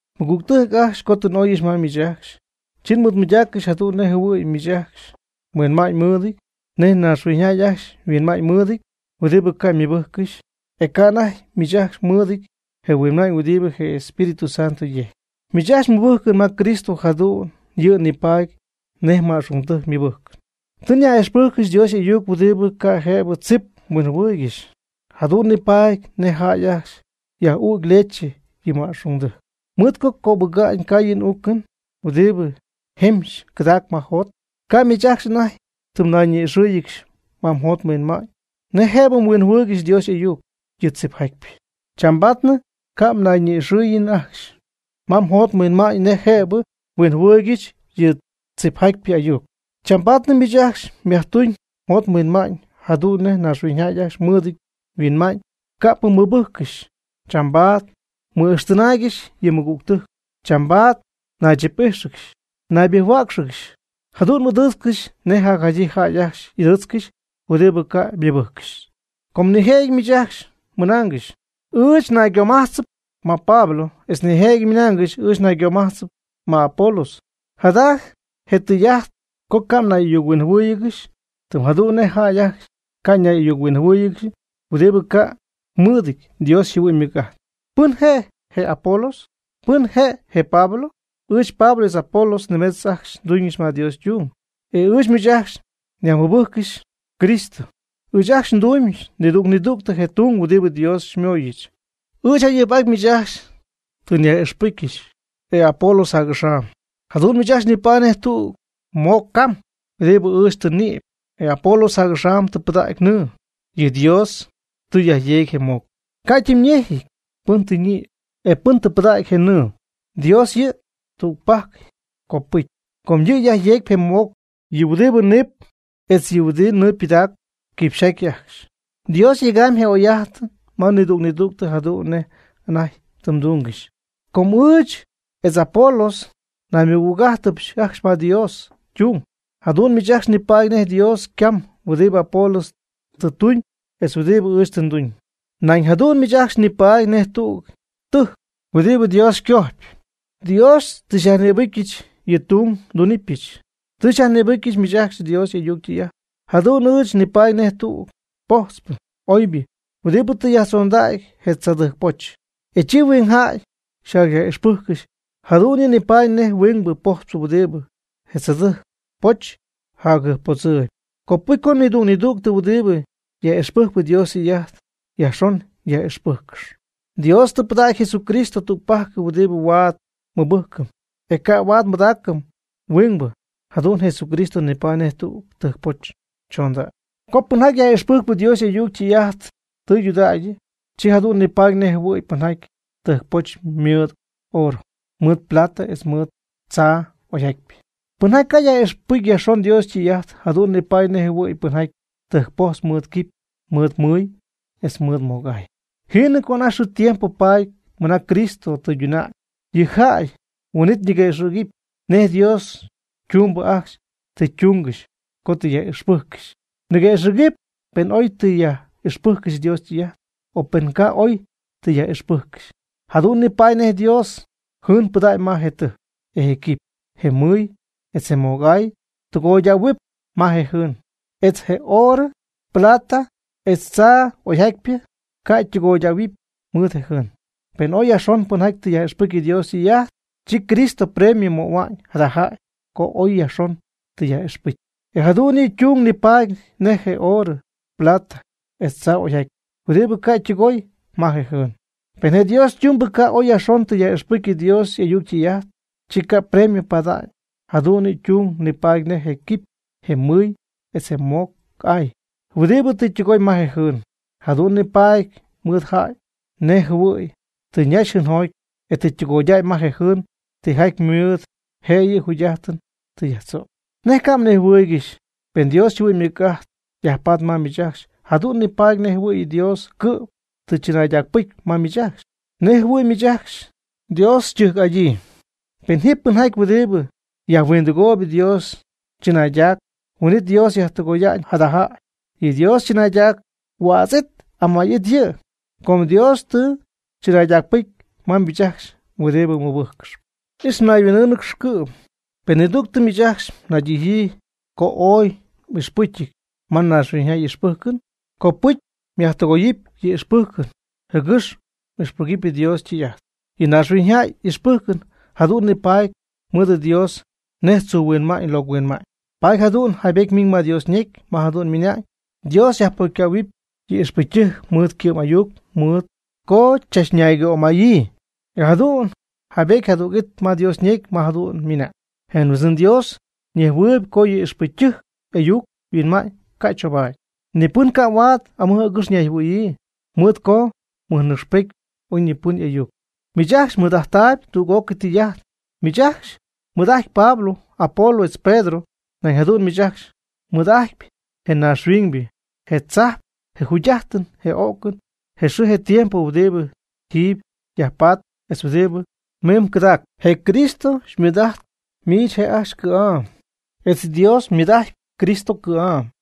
Mɨgügtɨjc ajcxy, co tɨ n'oyɨch ma miich ajcxy, chi nmɨɨdmɨydaaccɨxy jadu'n nej jɨhuɨ̈y miich ajcxy mhuinma'ñymɨɨdɨty nej naaxhuiñyjäy ajcxy yhuinma'ñymɨɨdɨty huɨdibɨ ca' ymɨbɨjccɨxy. E ca' anajty miich ajcxy mɨɨdɨty je mhuinma'ñ huɨdibɨ je Espíritu Santo yejcpy. Miich ajcxy mmɨbɨjcɨn ma Cristo jadu'n yɨ' nipaady nej ma'xungdɨjc ymɨbɨjcɨn. Tɨ nyaj'ixpɨjccɨxy Dios y'ayuc huɨdibɨ ca' jëbɨ tzip mhuinjɨhuɨɨygɨxy. Jadu'n nipaady nej jäy ajcxy yaj'ügy leche yɨ ma'xungdɨjc, mɨɨd co cacöbɨga'ñ caayɨn uucɨn huɨdibɨ jemxy cɨdacp ma yjot. Ca' miich ajcxy anajty tɨ mnayñi'ixɨ́ɨyɨgɨxy ma mjot mhuinma'ñ nej jëbɨ mhuinjɨhuɨɨygɨxy Dios y'ayuc yɨ tzipjatypɨ. Chambaadnɨ ca' mnayñi'ixɨ̈yiinɨ ajcxy ma mjot mhuinma'ñ nej jëbɨ mhuinjɨhuɨɨygɨxy yɨ tzipjatypɨ ayuc. Chambaadnɨ miich ajcxy myajtuñ mjot mhuinma'ñ jadu'n nej naaxhuiñjäy ajcxy mɨɨdɨty huinma'ñ ca'pɨ ymɨbɨjccɨxy, chambaad mmɨ'ijxtɨnaaygɨx yɨ mɨgügtɨjc, chambaad mnaychip'íjxɨgɨx naybɨjc-huäcxɨgɨx. Jadu'n m'ɨdɨɨtzcɨxy nej jacjadyii jäy ajcxy y'ɨdɨɨtzcɨxy huɨdibɨ ca' ymɨbɨjccɨxy. Com nijëjɨty miich ajcxy mɨnaangɨxy: “Ɨɨch naygomajtzɨp ma Pablo.” Etz nijëjɨty mɨnaangɨxy: “Ɨɨch naygomajtzɨp ma Apolos.” Jada je tɨy'ajt co ca' mnay'ayuc-huinjɨhuɨ́ɨyɨgɨxy tɨm jadu'n nej jäy ajcxy ca' nay'ayuc-huinjɨhuɨ́ɨyɨgɨxy huɨdibɨ ca' mɨɨdɨty Dios yjɨhuɨ'ñ ymɨc'ajt. ¿Pɨn je' je Apolos? ¿Pɨn je' je Pablo? Ɨɨch Pablo etz Apolos nimetz ajcxy nduñ ma Dios ytung, e ɨɨch miich ajcxy nyajmɨbɨjccɨxy Cristo. Ɨɨch ajcxy nduñ nidüg nidüg je tung huɨdibɨ Dios xymooyɨch. Ɨɨch jayɨjp'aty miich ajcxy tɨ nyaj'ixpɨcyɨch, e Apolos jac'axam. Jadu'n miich ajcxy nipaady nej tüg moc cam huɨdibɨ ɨɨch tɨ nnïpy, e Apolos jac'axam tɨ pɨdägy nɨɨ. Per Dios tɨ yajyeegy je moc. Ca' ytimyñejɨty pɨn tɨ yñïpy, e pɨn tɨ pɨdägy je nɨɨ. Dios yɨ' tügpajc copɨcyɨp. Com yɨ' yajyeecp je moc. Yɨ' huɨdibɨ niip etz yɨ' huɨdibɨ nɨɨ pɨdacp, quipxyjaty ajcxy. Dios yegamb je oy'ajt ma nidüg nidüg jadu'n nej anajty tɨ ytungɨxy. Com ɨɨch etz Apolos naymɨgüg'ájtɨbɨch ajcxy ma Dios ytung. Jadu'n miich ajcxy nipaady nej Dios ycam huɨdibɨ Apolos tɨ tuñ etz huɨdibɨ ɨɨch tɨ nduñ. Nañ jadu'n miich ajcxy nipaady nej tüg tɨjc huɨdibɨ Dios ycojpy. Dios tɨ xyajnïbɨcyɨch yɨ' ytung ndunɨpyɨch. Tɨ nyaj'ixpɨcyɨch miich ajcxy Dios y'ayuc ytɨy'ajt. Jadu'n ɨɨch nipaady nej tüg pojtzpɨ oybɨ huɨdibɨ tɨ yajtzondägy je tzaadɨjc poch. Chi huingjäy xyjacyaj'ixpɨjccɨxy. Jadu'n yɨ' nipaady nej huingbɨ pojtzpɨ huɨdibɨ je tzaadɨjc poch jacjɨjppodzɨɨyb. Copɨcy co nidüg nidüg huɨdibɨ yaj'ixpɨjcp Dios ytɨy'ajt yajxon yaj'ixpɨ́jccɨxɨpy. Dios tɨ pɨdägy Jesucristo tügpajc huɨdibɨ huaad nmɨbɨjcɨm, e ca' huaad pɨdacy huingbɨ. Jadu'n Jesucristo nipaady nej tüg tɨjcpoch chondägy. Co pɨnjaty yaj'ixpɨcy Dios y'ayuc ytɨy'ajt tɨydudägy, chi jadu'n nipaady nej jɨhuɨ̈y pɨnjaty tɨjcpojtzp mɨɨd orɨ, mɨɨd plata etz mɨɨd tzaa oyjatypɨ. Pɨnjaty ca' yaj'ixpɨcy yajxon Dios ytɨy'ajt, jadu'n nipaady nej jɨhuɨ̈y pɨnjaty tɨjcpojtzp mɨɨd quipy, mɨɨd mɨy, etz mɨɨd moc'aay. Jiinɨ co anajty xɨɨ tiempo paady mɨna Cristo tɨyduna'ñ yɨ' yjäy huin'it ñiguëxɨ̈gɨpy nej Dios ytumbɨ ajcxy tɨ ytungɨxy co tɨ yaj'ixpɨjccɨxy. Niguëxɨ̈gɨp pen oy tɨ yaj'ixpɨjccɨxy Dios ytɨy'ajt, o pen ca' oy tɨ yaj'ixpɨjccɨxy. Jadu'n nipaady nej Dios jɨɨn pɨdägy ma je tɨjc, e je quipy, je mɨy, etz je moc'aay tɨgoydähuɨpy ma je jɨɨn. Etz je orɨ, plata etz tzaa oyjatypɨ ca' ytɨgoydähuɨpy mɨɨd je jɨɨn. Penɨ oy yajxon pɨnjaty tɨ yaj'ixpɨcy Dios ytɨy'ajt, chi Cristo premio möhua'ñ jada jäy co ooy yajxon tɨ yaj'ixpɨcy. E jadu'n yɨ' ytung nipaadɨp nej je orɨ, plata, etz tzaa'oyjatypɨ huɨdibɨ ca' ytɨgooy ma je jɨɨn. Pen je Dios ytumbɨ ca' oy yajxon tɨ yaj'ixpɨcy Dios y'ayuc ytɨy'ajt, chi ca' premio pada'ñ. Jadu'n yɨ' ytung nipaadɨp nej je quipy, je mɨy, etz je moc'aay huɨdibɨ tɨ ytɨgoy ma je jɨɨn. Jadu'n nipaadɨp mɨɨd jada jäy nej jɨhuɨ̈y tɨ ñaxy jɨɨnjoty, e tɨ ytɨgoydäy ma je jɨɨn tijaty ymɨɨd, je'yɨ yjugy'ajtɨn tɨ yajtzögy. ¿Nej ca' mnejhuɨɨygɨxy? Pen Dios yjɨhuɨ'ñ ymɨc'ajt yajpat ma miich ajcxy, jadu'n nipaady nej jɨhuɨ̈y Dios cɨ'm tɨ chɨnaydacpɨcy ma miich ajcxy, nej jɨhuɨ̈y miich ajcxy Dios xytɨjc'adyii. Pen ji pɨnjaty huɨdibɨ yajhuindɨgoy Dios chɨnaydac, huin'it Dios yajtɨgoya'ñ jada jäy. Yɨ Dios chɨnaydac huädz'it amay'it yɨ', com Dios tɨ chɨnaydacpɨcy ma miich ajcxy huɨdibɨ mɨbɨjccɨxp. Ix mnayhuin'ɨ́ɨnɨgɨx cɨ'm. Pen nidügtɨ miich ajcxy mnaydijyii co oy ixpɨcyɨty ma naaxhuiñyjäy y'ixpɨjcɨn, copɨcy jäydɨgoyɨpy yɨ' y'ixpɨjcɨn, jɨgɨx ixpɨgɨpy Dios ytɨy'ajt. Yɨ naaxhuiñyjäy y'ixpɨjcɨn jadu'n nipaady mɨɨd Dios nej tzuu huinma'ñ locɨ huinma'ñ. Paady jadu'n yjaybetyɨty ma Dios ñecy ma jadu'n ymɨna'ñ: “Dios yajpocycähuɨp yɨ ixpɨcytɨjc mɨɨd ycɨ'm'ayuc mɨɨd co chachnaygömayii.” E jadu'n yjaybetyɨty jadüg'it ma Dios ñecy ma jadu'n ymɨna'ñ: “Je Huindzɨn Dios ñejhuɨɨyb co yɨ ixpɨcytɨjc y'ayuc yhuinma'ñ ca' choobaady.” Ni pɨn ca' huaad amɨj agɨx ñayjɨhuɨ̈yii, mɨɨd co mɨjnɨcxpety oyñipɨn y'ayuc. Miich ajcxy mɨɨd'ajttaayb tüg'ócɨy tijaty. Miich ajcxy mɨɨd'ajtpy Pablo, Apolos etz Pedro. Nañ jadu'n miich ajcxy mɨɨd'ajtpy je naaxhuiñybɨ, je tzajp, je jugy'ajtɨn, je o'cɨn, je xɨɨ je tiempo huɨdibɨ ji yajpatp, etz huɨdibɨ mim cɨdaacp. Je Cristo mɨɨd'ajtpy miich je' ajcxy cɨ̈'am etz Dios ymɨɨd'ajtpy Cristo cɨ̈'am.